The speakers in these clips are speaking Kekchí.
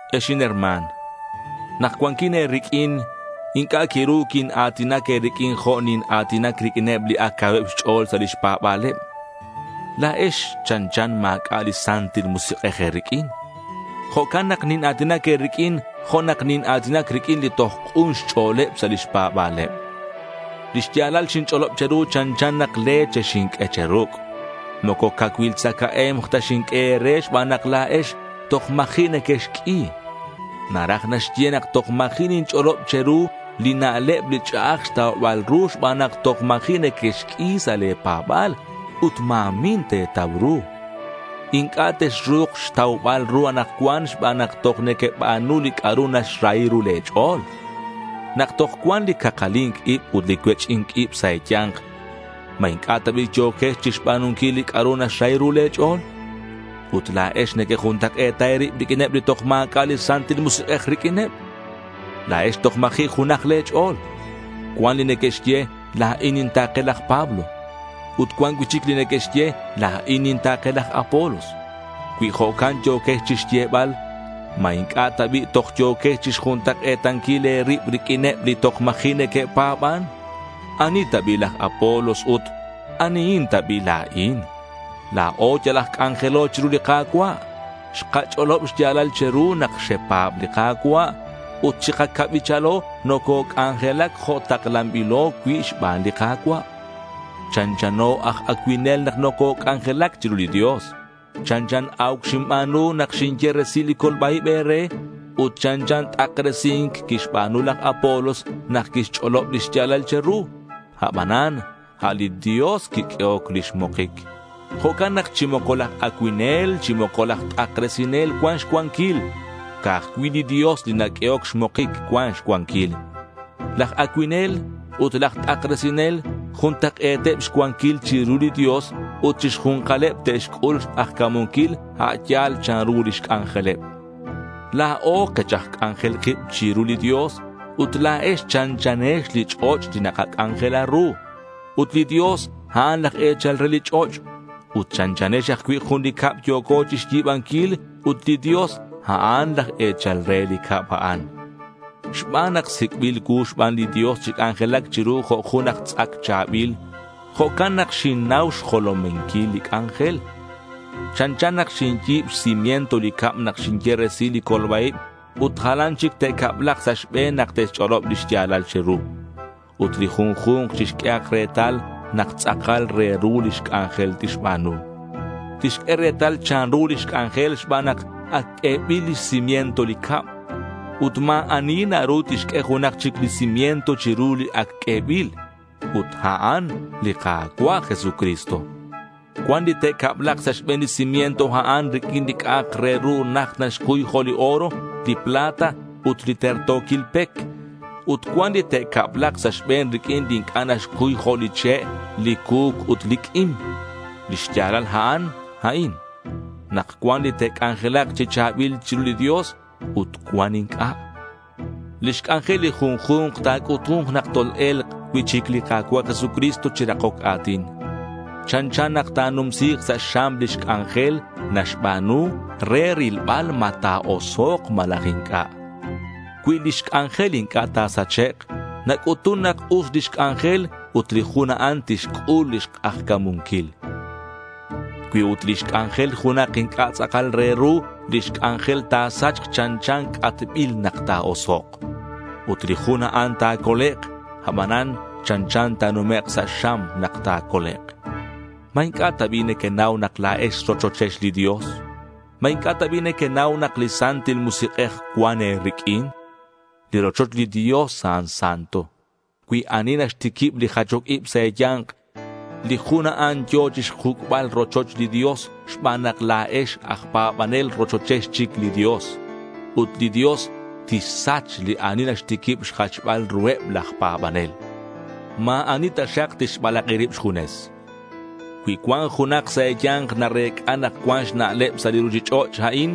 Ex inherma̱n, nak cuanquin e̱riq'uin inc'a' quiru quina̱tinac e̱riq'uin jo' nina̱tinac riq'uineb li ac cauheb xch'o̱l sa' lix pa̱ba̱leb. La̱ex chanchan ma̱c'a' li Santil Musik'ej e̱riq'uin. Jo'can nak nina̱tinac e̱riq'uin jo' nak nina̱tinac riq'uineb li toj k'un xch'o̱leb sa' lix pa̱ba̱leb. Li xya̱lal xinch'olob che̱ru chanchan nak leche xinq'ue cheruc'. Moco cacuil tzacae̱mk ta xinq'ue e̱re xban nak la̱ex toj ma̱ji' nequexq'ui. Naraj naxye nak toj ma̱ji' ninch'olob che̱ru li na'leb li ch'a'aj xtaubal ru xban nak toj ma̱ji' nequexq'ui sa' le̱ pa̱ba̱l ut ma̱min te̱tau ru. Inc'a' texru̱k xtaubal ru anakcuan xban nak toj nequeba̱nu li c'a'ru naxrahi ru le̱ ch'o̱l. Nak toj cuan li cakali̱nc ib ut li cuech'i̱nc ib sa' e̱ya̱nk, ¿ma inc'a' ta bi' yo̱quex chi xba̱nunquil li c'a'ru naxrahi ru le̱ ch'o̱l? Ut la̱ex nequejuntak'e̱ta e̱rib riq'uineb li toj ma̱c'a' li Santil Musik'ej riq'uineb. La̱ex toj ma̱ji' junaj le̱ ch'o̱l. Cuan li neque'xye, “la̱in ninta̱ke laj Pablo”. Ut cuan cui'chic li neque'xye, “la̱in ninta̱ke laj Apolos”. Cui jo'can yo̱quex chixyebal, ¿ma inc'a' ta bi' toj yo̱quex chixjuntak'e̱tanquil e̱rib riq'uineb li toj ma̱ji' neque'pa̱ban? ¿Ani ta bi' laj Apolos? Ut, ¿anihin ta bi' la̱in? La̱o yal aj c'anjelo chiru li Ka̱cua'. Xkach'olob xya̱lal che̱ru nak xepa̱b li Ka̱cua'. Ut chi kacabichalo nococ'anjelac jo' taklanbilo cui' xban li Ka̱cua'. Chanchano aj acuinel nak nococ'anjelac chiru li Dios. Chanchan a̱uc xinba̱nu nak xinye resil li colba-ib e̱re. Ut chanchan t'akresi̱nc quixba̱nu laj Apolos nak quixch'olob lix ya̱lal che̱ru. Abanan a' li Dios quiq'uehoc lix mokic. Jo'can nak chi moco laj acuinel chi moco laj t'akresinel cuan xcuanquil. Ca'aj cui' li Dios li naq'uehoc xmokic cuan xcuanquil. Laj acuinel ut laj t'akresinel juntak'e̱teb xcuanquil chiru li Dios ut chi xju̱nkaleb te'xc'ul xk'ajca̱munquil a' ya̱l chanru lix c'anjeleb. La̱o kech aj c'anjelil kib chiru li Dios. Ut la̱ex chanchanex li ch'och' li nakac'anjela ru. Ut li Dios a'an laj e̱chal re li ch'och'. Ut chanchanex ajcui' jun li cab yo̱co chixyi̱banquil ut li Dios, a'an laj e̱chal re li cab a'an. Xban nak sic'bil cuu xban li Dios chi c'anjelac chiru jo' jun aj tz'ac cha̱bil, jo'can nak xinnau xjolominquil li c'anjel. Chanchan nak xinyi̱b xcimiento li cab nak xinye resil li colba-ib ut jalan chic te'cablak sa' xbe̱n nak te'xch'olob li xya̱lal che̱ru. Ut li junju̱nk chixq'uehak retal nak tz'akal re ru lix c'anjel tixba̱nu. Tixq'ue retal chanru lix c'anjel xban nak ac q'uebil lix cimiento li cab. Ut ma̱ ani naru tixq'ue junak chic li cimiento chiru li ac q'uebil. Ut a'an li Ka̱cua' Jesucristo. Cuan li te'cablak sa' xbe̱n li cimiento a'an riq'uin li c'a'ak re ru najt naxcuy jo' li oro, li plata ut li terto̱quil pec. Ut cuan li te'cablak sa' xbe̱n riq'uin li inc'a' naxcuy jo' li che', li cu̱c ut li q'uim. Lix ya̱lal a'an, a'in: nak cuan li te'c'anjelak chi cha̱bil chiru li Dios ut cuan inc'a'. Lix c'anjel li junju̱nk ta̱c'utu̱nk nak tol-e̱lk cui'chic li Ka̱cua' Jesucristo chi rakoc a̱tin. Chanchan nak ta̱numsi̱k sa' xam lix c'anjel naxba̱nu re rilbal ma ta̱osok' malaj inc'a'. Cui lix c'anjel inc'a' ta̱sachek', nac'utun nak us lix c'anjel ut li jun a'an tixc'ul lix k'ajca̱munquil. Cui ut lix c'anjel junak inc'a' tz'akal re ru, lix c'anjel ta̱sachk chanchan c'atbil nak ta̱osok'. Ut li jun a'an ta̱colek', abanan chanchan ta̱numek' sa' xam nak ta̱colek'. ¿Ma inc'a' ta bi' nequenau nak la̱ex rochochex li Dios? ¿Ma inc'a' ta bi' nequenau nak li Santil Musik'ej cuan e̱riq'uin? Li rochoch li Dios a'an santo. Cui ani naxtiquib li jachoc ib sa' e̱ya̱nk, li jun a'an yo̱ chixjuc'bal rochoch li Dios xban nak la̱ex aj pa̱banel rochochex chic li Dios. Ut li Dios tixsach li ani naxtiquib xjachbal ruheb laj pa̱banel. Ma̱ ani taxak tixbalak'i rib xjunes. Cui cuan junak sa' e̱ya̱nk narec'a nak cuan xna'leb sa' li ruchich'och' a'in,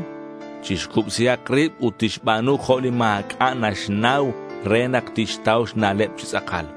chixcubsihak rib ut tixba̱nu jo' li ma̱c'a' naxnau re nak tixtau xna'leb chi tz'akal.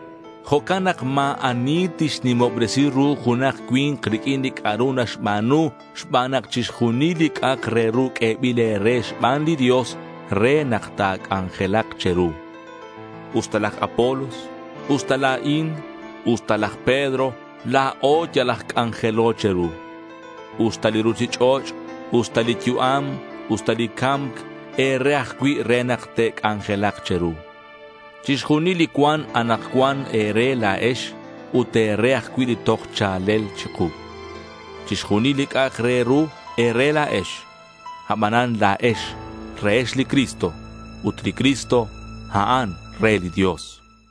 Jo'can nak ma̱ ani tixnimobresi ru junak cui̱nk riq'uin li c'a'ru naxba̱nu xban nak chixjunil li c'a'ak re ru q'uebil e̱re xban li Dios re nak ta̱c'anjelak che̱ru. Usta laj Apolos, usta la̱in, usta laj Pedro, la̱o yal aj c'anjelo che̱ru. Usta li ruchich'och', usta li yu'am, usta li ca̱mc, e̱re ajcui' re nak te'c'anjelak che̱ru. Chixjunil li cuan anakcuan e̱re la̱ex ut e̱re ajcui' li toj cha̱lel chiku. Chixjunil li c'a'ak re ru, e̱re la̱ex. Abanan la̱ex rehex li Cristo ut li Cristo, a'an re li Dios.